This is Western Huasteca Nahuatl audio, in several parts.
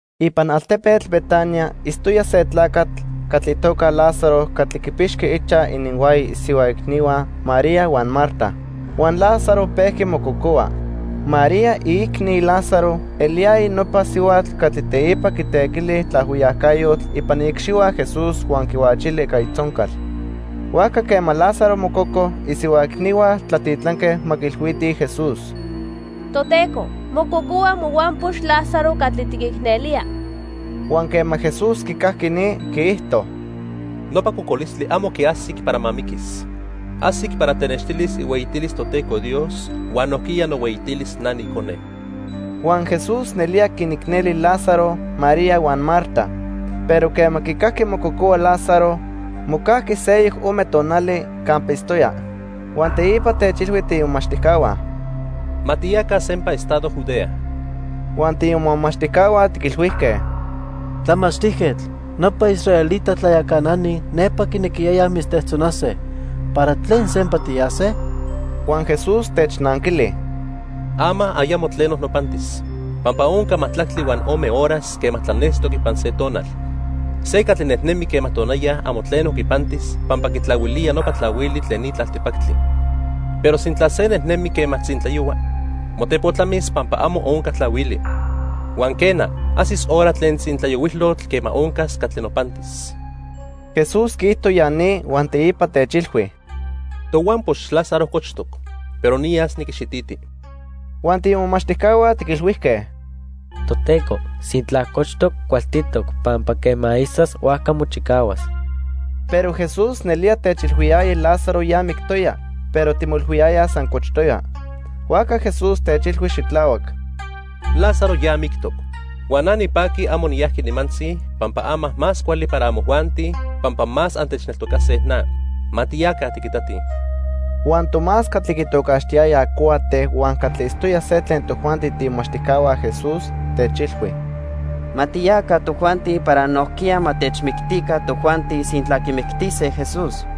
Ipan altepetl Betania itztoya se tlacatl catli itoca Lázaro catli quipixqui ichaj ininhuaya isihua icnihua, María huan Marta. Huan Lázaro pejqui mococohua. (María, iicni Lázaro, eliyaya nopa sihuatl catli teipa quitequili tlaajhuiyacayotl ipan iicxihua Jesús huan quihuachili ica itzoncal.) Huajca quema Lázaro mococo, isihua icnihua tlatitlanque ma quiilhuitij Jesús: —Toteco, mococohua mohuampox Lázaro catli tiquicnelía. Huan quema Jesús quicajqui ni, quiijto: —Nopa cocolistli amo quiajsic para ma miquis. Ajsic para tenextilis ihueyitilis Toteco Dios huan nojquiya nohueyitilis na niIcone. Huan Jesús nelía quinicneli Lázaro, María huan Marta. Pero quema quicajqui mococohua Lázaro, mocajqui seyoc ome tonali campa itztoya. Huan teipa techilhui tiimomachtijcahua: —Ma tiyaca sempa estado Judea. Huan tiimomachtijcahua tiquilhuijque: —Tlamachtijquetl, nopa israelita tlayacanani nepa quinequiyayaj mitztejtzonase, ¿para tlen sempa tiyase? Huan Jesús technanquili: —Ama ayamo tleno nopantis, pampa onca majtlactli huan ome horas quema tlanestoc ipan se tonal. Se catli nejnemi quema tonaya amo tleno quipantis pampa quitlahuilía nopa tlahuili tlen ni tlaltipactli. Pero sintla se nejnemi quema tzintlayohua, motepotlamis pampa amo onca tlahuili. Huan quena, ajsis hora tlen tlatzintlayohuilotl quema oncas catli nopantis. Jesús quiijto ya ni huan teipa techilhui: —Tohuampox Lázaro cochtoc, pero niyas niquixititi. Huan tiimomachtijcahua tiquilhuijque: —Toteco, sintla cochtoc, cualtitoc, pampa quema isas, huajca mochicahuas. Pero Jesús nelía techilhuiyaya Lázaro ya mictoya, pero timoilhuiyayaj san cochtoya. Huajca Jesús techilhui xitlahuac: —Lázaro ya mictoc. Huan na nipaqui amo niyajqui nimantzi pampa ama más cuali para amojuanti pampa más antechneltocase na. Ma tiyaca tiquitatij. Huan Tomás catli quitocaxtiyayaj Cuate huan catli itztoya se tlen tojuanti tiimomachtijcahua Jesús techilhui: —Ma tiyaca tojuanti para nojquiya ma techmictica tojuanti sintla quimictise Jesús.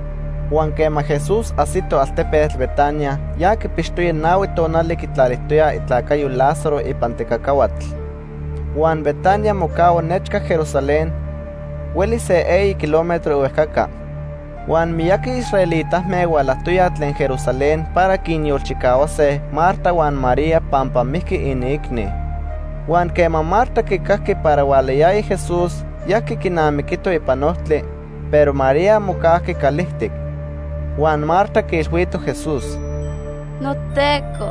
Huan quema Jesús ajsito altepetl Betania, ya quipixtoya nahui tonali quitlalijtoyaj itlacayo Lázaro ipan tecacahuatl. Huan Betania mocahua nechca Jerusalén, huelis se eyi kilómetro ihuejcaca. Huan miyaqui israelitame hualajtoyaj tlen Jerusalén para quinyolchicahuase Marta huan María pampa mijqui iniicni. Huan quema Marta quicajqui para hualayaya Jesús, yajqui quinamiquito ipan ojtli, pero María mocajqui calijtic. Huan Marta quiilhuito Jesús: —NoTeco,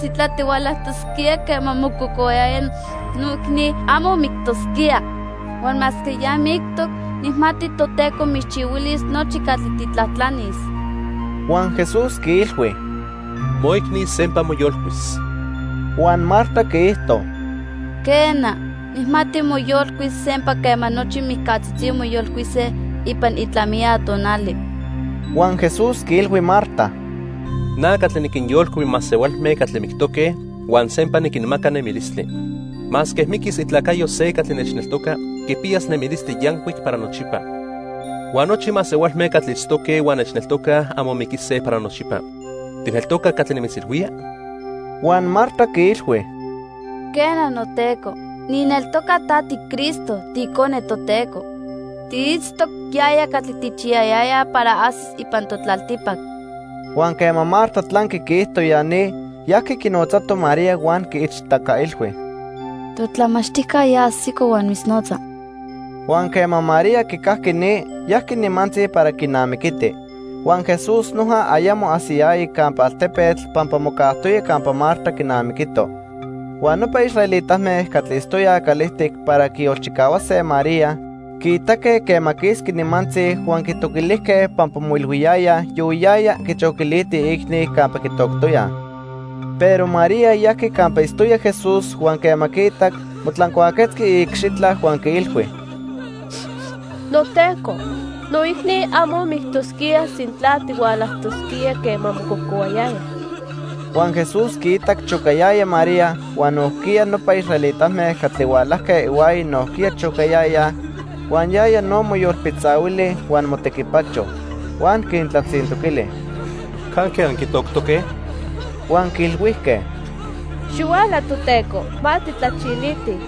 sintla tihualajtosquía quema mococohuayaya, noicni amo mictosquía. Huan masque ya mictoc, nijmati Toteco mitzchihuilis nochi catli tijtlajtlanis. Huan Jesús quiilhui: —Moicni sempa moyolcuis. Huan Marta quiijto: —Quena, nijmati moyolcuis sempa quema nochi mijcatzitzi moyolcuise ipan itlamiya tonali. Huan Jesús quiilhui Marta: —Na catli niquinyolcui masehualme catli mictoque huan sempa niquinmaca nemilistli. Masque miquis itlacayo se catli nechneltoca, quipiyas nemilistli yancuic para nochipa. Huan nochi masehualme catli itztoque huan nechneltocaj amo miquise para nochipa. ¿Tijneltoca catli nimitzilhuía? Huan Marta quiilhui: —Quena, noTeco nijneltoca ta tiCristo, tiIcone Toteco. Tiitztoc yaya catli tijchiyayayaj para ajsis ipan totlaltipac. Huan quema Marta tlanqui quiijto ya ni, yajqui quinotzato María huan quiichtacailhui: —Totlamachtijca ya ajsico huan mitznotza. Huan quema María quicajqui ni, yajqui nimantzi para quinamiquiti. Huan Jesús noja ayamo ajsiyaya campa altepetl pampa mocajtoya campa Marta quinamiquito. Huan nopa israelitame catli itztoyaj calijtic para quiyolchicahuase María quiitaque quema quisqui nimantzi huan quitoquilijque pampa moilhuiyayaj yohuiyaya quichoquiliti iicni campa quitoctoyaj. Pero María yajqui campa itztoya Jesús huan quema quiitac, motlancuaquetzqui iicxitla huan quiilhui: —NoTeco, noicni amo mictosquía sintla tihualajtosquía quema mococohuayaya. Huan Jesús quiitac chocayaya María huan nojquiya nopa israelitame catli hualajque ihuaya nojquiya chocayayaj, huan yaya no moyolpitzahuili huan motequipacho. Huan quintlatzintoquili: —¿Canque anquitoctoque? Huan quiilhuijque: —Xihuala, Toteco, ma tijtlachilitij.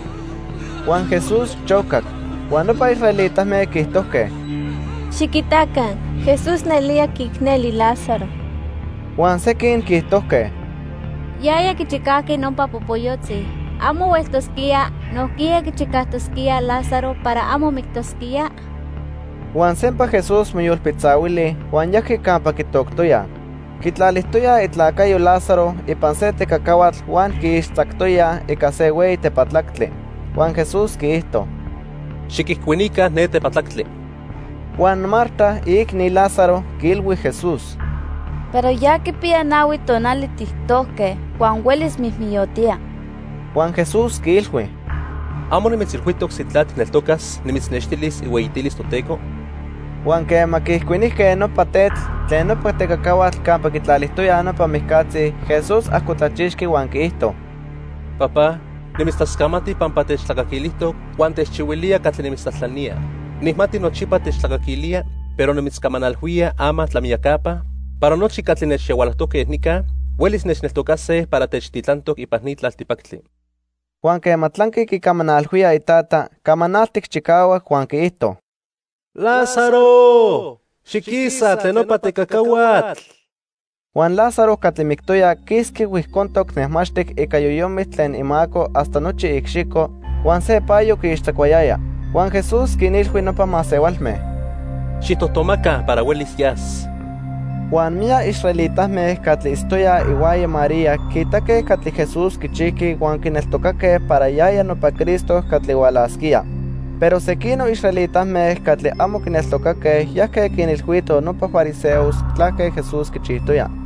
Huan Jesús chocac. Huan nopa israelitame quiijtojque: —Xiquitaca, Jesús nelía quiicneli Lázaro. Huan sequin quiijtojque: —Yaya quichicajqui nopa popoyotzi. ¿Amo hueltosquía nojquiya quichicajtosquía Lázaro para amo mictosquía? Huan sempa Jesús moyolpitzahuili huan yajqui campa quitoctoyaj. Quitlalijtoyaj itlacayo Lázaro ipan se tecacahuatl huan quiixtzactoyaj ica se hueyi tepatlactli. Huan Jesús quiijto: —Xiquijcuinica ne tepatlactli. Huan Marta, iicni Lázaro, quiilhui Jesús: —Pero ya quipiya nahui tonali tijtojque huan huelis mijmijyotía. Huan Jesús quiilhui: —¿Amo nimitzilhuijtoc sintla tijneltocas, nimitznextilis ihueyitilis Toteco? Huan quema quiijcuinijque nopa tetl tlen nopa tecacahuatl campa quitlalijtoyaj nopa mijcatzi, Jesús ajcotlachixqui huan quiijto: —Papá, nimitztlascamati pampa techtlacaquilijtoc huan techchihuilía catli nimitztlajtlanía. Nijmati nochipa techtlacaquilía, pero nimitzcamanalhuía ama tlamiyacapa para nochi catli nechyahualojtoque nica huelis nechneltocase para techtitlantoc ipan ni tlaltipactli. Huan quema tlanqui quicamanalhuía iTata, camanaltic chicahuac huan quiijto: —Lázaro, xiquisa tlen nopa tecacahuatl. Huan Lázaro catli mictoya quisqui huijcontoc nejmaxtic ica yoyomitl tlen imaco hasta nochi iicxico, huan se payo quiixtzacuayaya. Huan Jesús quinilhui nopa masehualme: —Xijtojtomaca para huelis yas. Huan miyac israelitame catli itztoyaj ihuaya María quiitaque catli Jesús quichijqui huan quineltocaque para yaya nopa Cristo catli hualasquía. Pero sequinoc israelitame catli amo quineltocaque yajque quinilhuitoj nopa fariseos tlaque Jesús quichijtoya.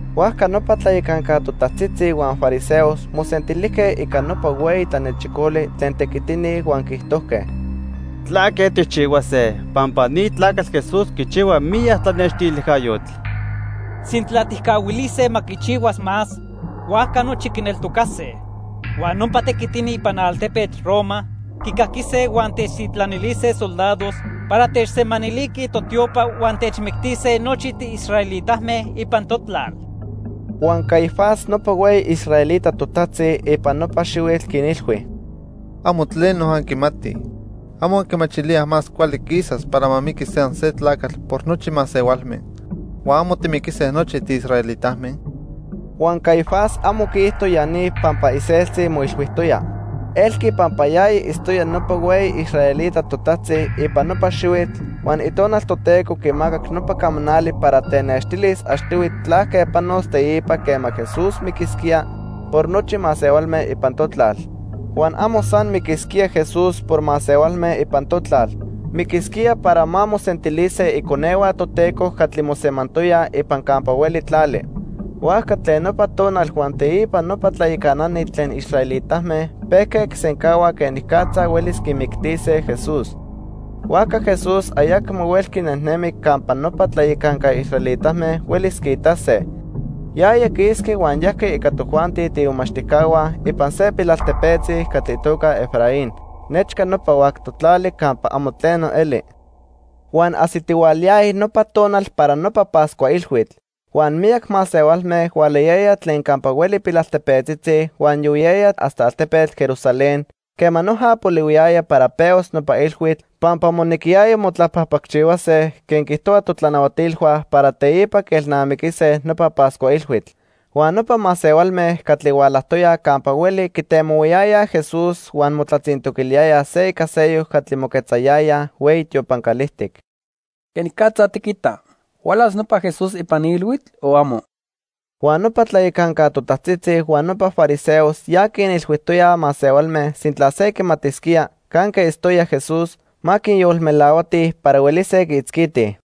Huajca nopa tlayacanca totajtzitzi huan fariseos mosentilijque ica nopa hueyi tlanechicoli tlen tequitini huan quiijtojque: —¿Tlaque tijchihuase? Pampa ni tlacatl Jesús quichihua miyac tlanextilijcayotl. Sintla tijcahuilise ma quichihuas más, huajca nochi quineltocase. Huan nopa tequitini ipan altepetl Roma quicaquise huan techtitlanilise soldados para techsemaniliquij totiopa huan techmictise nochi tiisraelitame ipan totlal. Huan Caifás nopa hueyi israelita totajtzi ipan nopa xihuitl quinilhui: —Amo tleno anquimatij. ¿Amo anquimachilíaj más cuali quisas para ma miquis san se tlacatl por nochi masehualme huan amo timiquise nochi tiisraelitame? Huan Caifás amo quiijto ya ni pampa iseltzi moilhuijtoya. Elqui pampa yaya itztoya nopa hueyi israelita totajtzi ipan nopa xihuitl huan Itonal Toteco quimacac nopa camanali para tenextilis achtihui tlaque panos teipa quema Jesús miquisquía por nochi masehualme ipan totlal. Huan amo san miquisquía Jesús por masehualme ipan totlal, miquisquía para ma mosentilise iconehua Toteco catli mosemantoyaj ipan campa hueli tlali. Huajca tlen nopa tonal huan teipa nopa tlayacanani tlen israelitame pejque quisencahuaj quenicatza huelis quimictise Jesús. Huajca Jesús ayacmo huelqui nejnemi campa nopa tlayacanca israelitame huelis quiitase. Yaya quisqui huan yajqui ica tojuanti tiimomachtijcahua ipan se pilaltepetzi catli itoca Efraín nechca nopa huactoc tlali campa amo tleno eli. Huan ajsitihualayaya nopa tonal para nopa Pascua Ilhuitl. Huan miyac masehualme hualayayaj tlen campa hueli pilaltepetzitzi huan yohuiyayaj hasta altepetl Jerusalén quema noja polihuiyaya para pehuas nopa ilhuitl pampa monequiyaya motlapajpacchihuase quen quiijtohuaj totlanahuatilhua para teipa quielnamiquise nopa Pascua Ilhuitl. Huan nopa masehualme catli hualajtoyaj campa hueli quitemohuayayaj Jesús huan motlatzintoquiliyayaj se ica seyoc catli moquetzayayaj hueyi tiopan calijtic: —¿Quenicatza tiquita? ¿Hualas nopa Jesús ipan ni ilhuitl o amo? Huan nopa tlayacanca totajtzitzi huan nopa fariseos ya quinilhuijtoyaj masehualme sintla se quimatisquía canque itztoya Jesús, ma quinyolmelahuatij para huelise quiitzquitij.